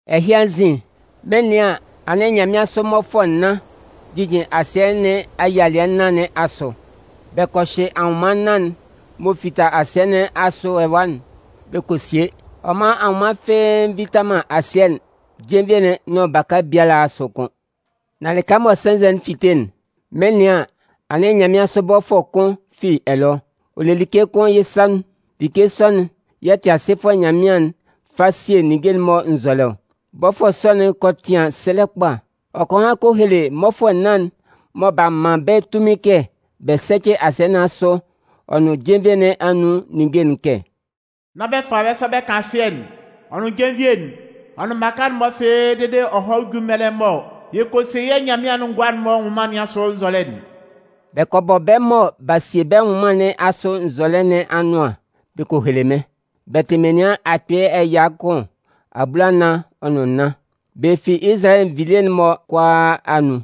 Ɛhɩ anzin, mɩn 'nɩan an, anɩn nyanmɩansʋ mmɔfʋɛ nnan jijin asɩɛ nɩn ayialɩɛ nnan nɩn asʋ. Bɛ kɔ hyɩ anwʋnman nnan'n m'ɔ fita asɩɛ nɩn asʋ ɛwa'n bɛ kɔ sie. Ɔ man anwʋnman fɩ́ɩ́ nvita man asɩɛ'n, jenvie'n nʋn baka biala asʋ kʋ́n. Nan lɩka mɔ sɛnzɛ'n fite'n, mɩn 'nɩan an, anɩn nyanmɩansʋ bɔfʋɛ kʋn fi ɛlɔ. Ɔ le like kʋn yɩ́ sa nun. Like sɔ'n yɛ̂ Tɩasɩfʋɛ Nyanmɩan'n fa sie ninnge'n-mɔ nzɔlɛ ɔ. Bɔfʋɛ sɔ'n kɔ tɩan sɛlɛ kpa. Ɔ kɔ han kɔ hele mmɔfʋɛ nnan'n mɔ b'a man bɛ́ tunmin kɛ bɛ sɛ́cɩ asɩɛ nɩn asʋ ɔ nʋn jenvie nɩn anun ninnge'n kɛ: “Nán bɛ fa bɛ́ sa bɛ kan asɩɛ'n, ɔ nʋn jenvie'n, ɔ nʋn mmaka'n-mɔ fɩ́ɩ́ dede ɔ hɔ́ jú mɛlɛ mɔ yɛ kɔ sie yɛ́ Nyanmɩan'n ngʋa'n-mɔ anwʋnman nɩn asʋ nzɔlɛ'n.” Bɛ kɔ bɔ bɛ́ mɔ b'a sie bɛ́ nwʋnman nɩn asʋ nzɔlɛ nɩn anʋan bɛ kɔ hele mɩ́n. Bɛ tɩ menian akpɩɩ ɛya kʋn abulanan ɔ nʋn nnan. Bɛ fi Izalayɛ nvilie'n-mɔ kʋalaa anun.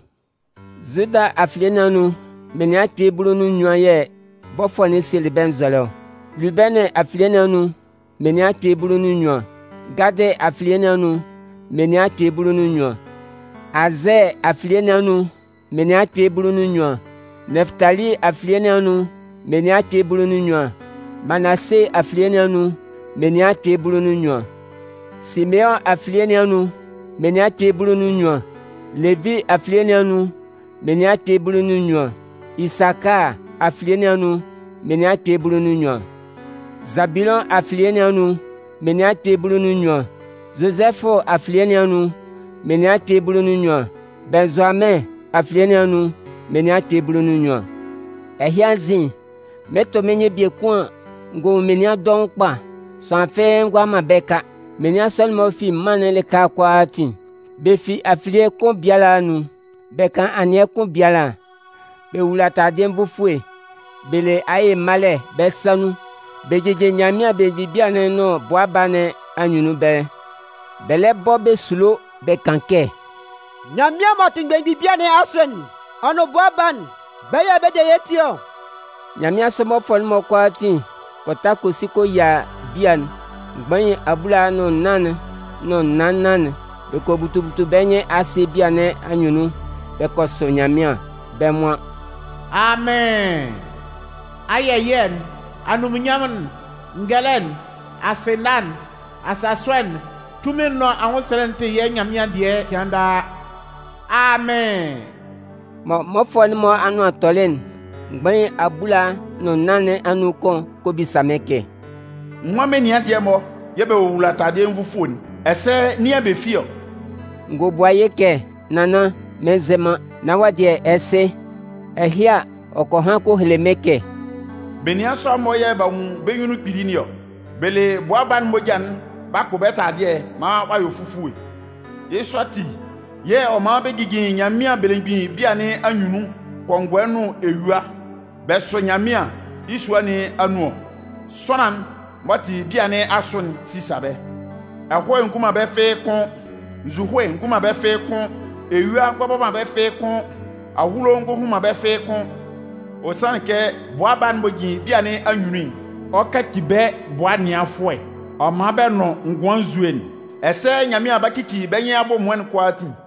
Zuda afilie nɩn anun, menian akpɩɩ bulu nʋn nnyuan yɛ̂ bɔfʋɛ'n sielɩ bɛ́ nzɔlɛ ɔ. Lubɛnɩn afilie nɩn anun menian akpɩɩ bulu nʋn nnyuan. Gadɩ afilie nɩn anun menian akpɩɩ bulu nʋn nnyuan. Azɛɛ afilie nɩn anun menian akpɩɩ bulu nʋn nnyuan. Nɛfʋtali afilie nɩn anun menian akpɩɩ bulu nʋn nnyuan. Manase afilie nɩn anun menian akpɩɩ bulu nʋn nnyuan. Simeʋn afilie nɩn anun menian akpɩɩ bulu nʋn nnyuan. Levi afilie nɩn anun menian akpɩɩ bulu nʋn nnyuan. Isakaa afilie nɩn anun menian akpɩɩ bulu nʋn nnyuan. Zabulʋn afilie nɩn anun menian akpɩɩ bulu nʋn nnyuan. Zozɛfʋ afilie nɩn anun menian akpɩɩ bulu nʋn nnyuan. Bɩnnzʋamɩn afilie nɩn anun menian akpɩɩ bulu nʋn nnyuan. Ɛhɩ anzin, mɩn 'tʋ mɩ́n nyɩn biekun an, n gɔ nwun menian dɔʋn kpa. Sʋanlan fɩ́ɩ́ ngʋala man bɛ́ ka. Menian sɔ'n-mɔ fi mân'n lɩka kʋalaatin, bɛ fi afilie kʋn biala anun, bɛ kan anɩɛ kʋn biala. Bɛ wowula taladɩɛ nvufue, bɛ le aye malɛ bɛ́ sa nun bɛ jijin Nyanmɩan belemgbin bia'n nʋn Bʋa Baa nɩn anyunnun ɛbɛlɛ. Bɛ lɛ bɔ bɛ sulo bɛ kan kɛ: “Nyanmɩan m'ɔ tɩ belemgbin bia nɩn asʋ'n, ɔ nʋn Bʋa Baa'n, bɛ́ yɛ̂ bɛ de yɛ́ ti ɔ.” Nyanmɩansʋ mmɔfʋɛ'n-mɔ kʋalaatin kɔ ta kɔ si kɔ yia bia'n, mgbain abulaa nʋn nnan'n nʋn naan nnan'n. Bɛ kɔ butu butu bɛ́ nyɩn asɩ bia nɩn anyunnun bɛ kɔ sʋ Nyanmɩan. Bɛ́ nwan: “Amɩn! Ayɛ ɛyɩɛ'n, anunminnyanmʋn'n, ngɛlɛ'n, asɩna'n, asasʋɛ'n, tunmin'n nʋn anwʋnsɛlɛ'n tɩ yɛ́ Nyanmɩan'n dɩɛ cɩan daa! Amɩn!” Mɔ mmɔfʋɛ'n-mɔ anʋan tɔlɩ'n, mgbain abulaa nʋn nnan nɩn anun kʋn kɔ bisa mɩ́n kɛ: “Nwan menian dɩɛ-mɔ yɛ̂ bɛ wowula taladɩɛ nvufue'n? Ɛsɛ nin yɛ̂ bɛ fi ɔ?” N gɔ bua yɩ́ kɛ: “Nannan, mɩn nzɩ man. Nan wɔ́ dɩɛ ɛ sɩ.” Ɛhɩ a, ɔ kɔ han kɔ hele mɩ́n kɛ: “Menian sɔ'n-mɔ yɛ̂ b'a nwun bɛ́ nyunnun kpili nɩn ɔ. Bɛ le Bʋa Baa'n moja'n b'a kpʋ bɛ́ taladɩɛ'n maan ɔ a yɔ fufue. Yɩ́ sɔ ati, yɛ̂ ɔ man bɛ jijin Nyanmɩan belemgbin bia nɩn anyunnun kɔngɔɛ nʋn eyua bɛ sʋ Nyanmɩan yɩ́ sua nɩn anun ɔ. Sʋanlan'n m'ɔ tɩ bia nɩn asʋ'n 'sisa bɛ́. Ɛhɔɛ ngɔ hun man bɛ́ fɩ́ɩ́ kʋ́n. Nzuhoe ngɔ hun man bɛ́ fɩ́ɩ́ kʋ́n. Eyua ngɔ bɔ man bɛ́ fɩ́ɩ́ kʋ́n. Ahulo ngɔ hun man bɛ́ fɩ́ɩ́ kʋ́n. Ɔ sanlɩn kɛ Bʋa Baa'n m'ɔ jin bia nɩn anyunnun'n, ɔ 'kaci bɛ́ bʋa ɛnɩanfʋɛ, ɔ 'man bɛ nʋn ngʋan nzue'n. Ɛsɛ Nyanmɩan 'ba cici bɛ́ nyɩn abʋ ɛmʋɩn'n kʋalaatin.”